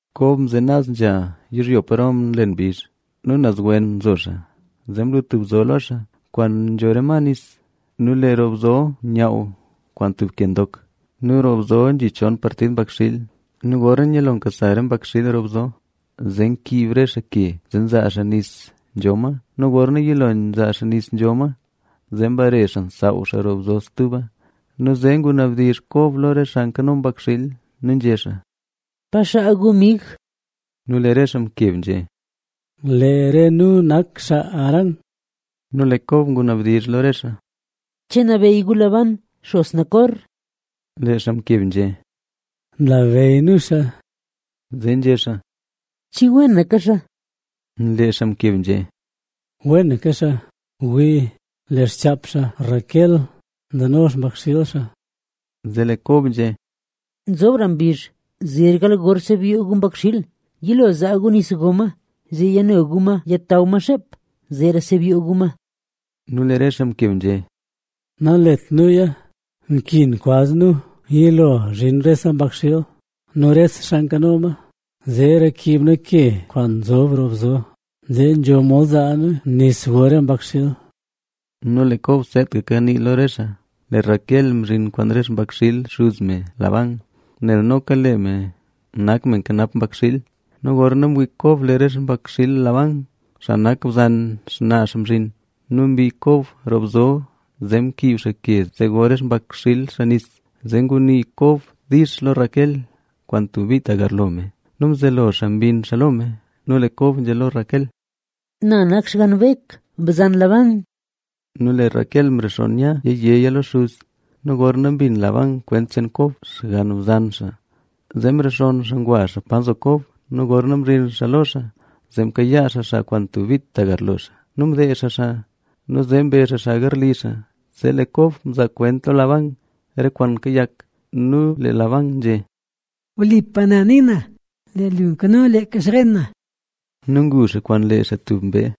Kob mzen naz nzha yizhyo paro nlen mbizh. Nu naz wen nzo xaa, zee mlu tub bzo lo xaa, kwaan nzho re ma nis. Nu lee roo bzo nyaaw kwaan tub ke ndok. Nu roo bzo nzhi chon partid mbakxiil. Nu gorna nyalo nkasa re mbakxiil roo bzo zee nkib re xaa ke, zee nzaa xaa nis nzho ma. Nu gorna yilo nzaa xaa nis nzho ma, zee mbare xaa nsaaw xaa roo bzo stuba. Nu zee ngunabdizh Kob lo re xaa nkano mbakxiil nu nzhé xaa: —¿Pa xaa gu, mig? Nu lee re xaa mkeb nzhé: —Lee re nu nak xaa Harán. Nu lee Kob ngunabdizh lo re xaa: —¿Che nlabeyy gu Labán, xos Nacor? Lee xaa mkeb nzhé: —Nlabeyy nu xaa. Zee nzhé xaa: —¿Che wenaka xaa? Lee xaa mkeb nzhé: —Wenaka xaa. Wii, lee xchaap xaa Raquel, nzeno xpakxiil xaa. Zee lee Kob nzhé: —Nzobra mbizh, zer gal gor sebyoo gu mbakxiil. Yilo zaa gu nis go ma, zee yano gu ma yataw ma xeep, zeera sebyoo gu ma. Nu lee re xaa mkeb nzhé: —Nalet nuya. Nkin kwaz nu yilo zhin rese mbakxiil nu re xaa nkano ma, zeera kib nu ke kwaan nzob roo bzo, zee nzho mod zaa nu nis go re mbakxiil. Nu lee Kob seetaka kanii lo re xaa, lee Raquel mzhin kwaan re xpakxiil xuz me Labán, nel noka lee me nak me nkanap mbakxiil. Nu gorna mwii Kob lee re xpakxiil Labán, xaa nak bzan xnaa xaa mzhin nu mbii Kob roo bzo zee mkiib xaa ke, zee go re xpakxiil xaa nis. Zee ngunii Kob dix lo Raquel kwaan tub bit tagarlo me nu mzelo xaa mbinn xaa lo me. Nu lee Kob nzhé lo Raquel: —Na nak xgann Bek, bzan Labán. Nu lee Raquel mrexonn nya yéya lo xuz. Nu gorna mbin Labán kwent cheen Kob, xgann bzan xaa, zee mrexonn xaa ngwa xaa pa nzo Kob. Nu gorna mzhin xaa lo xaa, zee mkayaa xaa xaa kwaan tub bit tagarlo xaa nu mdeezh xaa xaa. Nu zee mbe xaa xaa garli xaa. Zee lee Kob mzaa kwent lo Labán re kwaan kayak. Nu lee Labán nzhé: —¡Wlipa na ni na, lee lu nkano leeka xren na! Nu ngu xaa kwaan lee xaa tub mbee.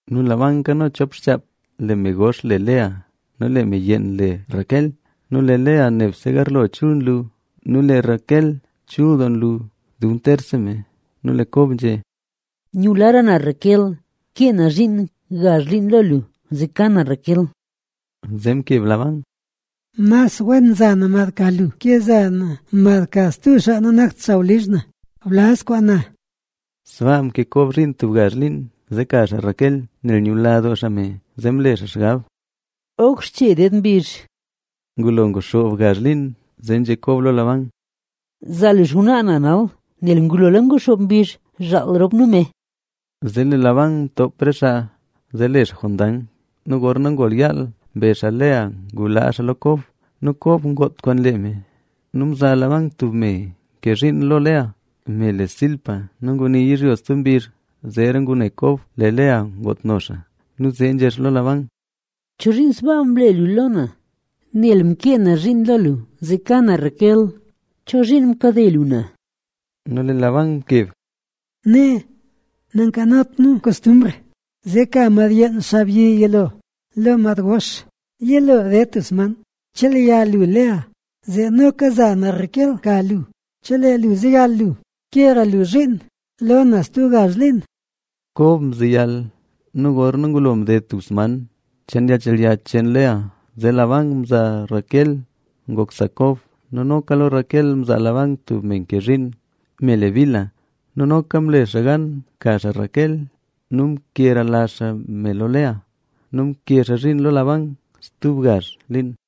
Nu Labán nkano chop xchaap, lee me gox le Lea nu lee me yeen le Raquel. Nu lee Lea nebse garlo chul nlu nu lee Raquel chul doo nlu dub terse me. Nu lee Kob nzhé: —Nyulara na Raquel. Ke na zhiin gazh liin lo lu zee ka na Raquel. Zee mkeb Labán: —Mas wen za na mad ka lu ke za na mad ka stub xaa nanakt sawlizh na. Blaz kwaan na. Sbaa mke Kob zhiin tub gazh liin zee ka xaa Raquel, nel nyula doo xaa me, zee mle xaa xgab: “Oj xche ded mbizh”. Ngulo nguxoob gazh liin, zee nzhé Kob lo Labán: —Zaa lu xngwnaa na nal, nel ngulola nguxoob mbizh zhaal rop nu me. Zee lee Labán mtoop re xaa zee le xaa jondang. Nu gorna ngol yaal mbe xaa Lea ngulaa xaa lo Kob. Nu Kob ngoot kwaan lee me. Nu mzaa Labán tub me ke zhiin lo Lea, me le Zilpa. Nu ngunil yizhyo stub mbizh, zeera ngune Kob lee Lea ngootno xaa. Nu zee nzhé xaa lo Labán: —¿Chozhiin sbaa mle lu lo na? ¡Nel mkee na zhiin lo lu zee ka na Raquel! ¿Chozhiin mkade lu na? Nu lee Labán mkeb: —Nee, nankanot nu kostumbr zee ka mad yeen xaabyi yilo lo mad gox. Yilo ded tub sman mchelya lu Lea, zee noka za na Raquel ka lu, chelee lu zeyal lu kera lu zhiin lo na stub gazh liin. Kob mzeyal nu gorna ngulo mded tub sman cheen yalnchelya cheen Lea, zee Labán mzaa Raquel ngok sa Kob. Nu noka lo Raquel mzaa Labán tub me ke zhiin, me le Bilha. Nu noka mle xaa gan mka xaa Raquel nu mkelara xaa me lo Lea. Nu mke xaa zhiin lo Labán stub gazh liin.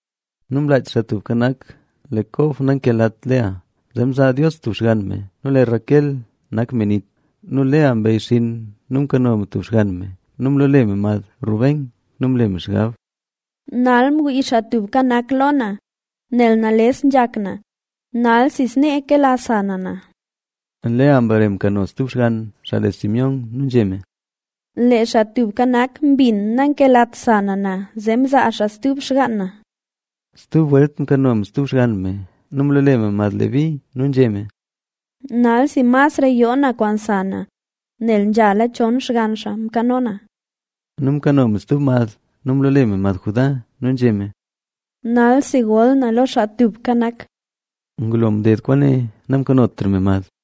Nu mlaach Xaa Tubka Nak lee Kob nankelat Lea, zee mzaa Dios tub xgann me. Nu lee Raquel nak me nit. Nu lee Lea mbeyxinn nu mkano me tub xgann me nu mloole me mad Ben.a Nel nzhe me: “Nal mwii Xaa Tubka Nak lo na, nel nales nzhak na, nalsi snee kela sa na na”. Lea mbare mkano stub xgann, xaa le Simeón.b Nu nzhé me: “Lee Xaa Tubka Nak mbin nankelat sa na na, zee mzaa xaa stub xgaan na”. Stub welt mkano me stub xgann me nu mloole me mad Leví.c Nu nzhé me: “Nalsi masra yoo na kwaan sa na, nel nzhala chon xgann xaa nkano na”. Nu mkano me stub mad nu mloole me mad Judá.d Nu nzhé me: “Nalsi gol na lo Xaa Tubka Nak”. Ngulo mded kwaane, namkanotra me mad.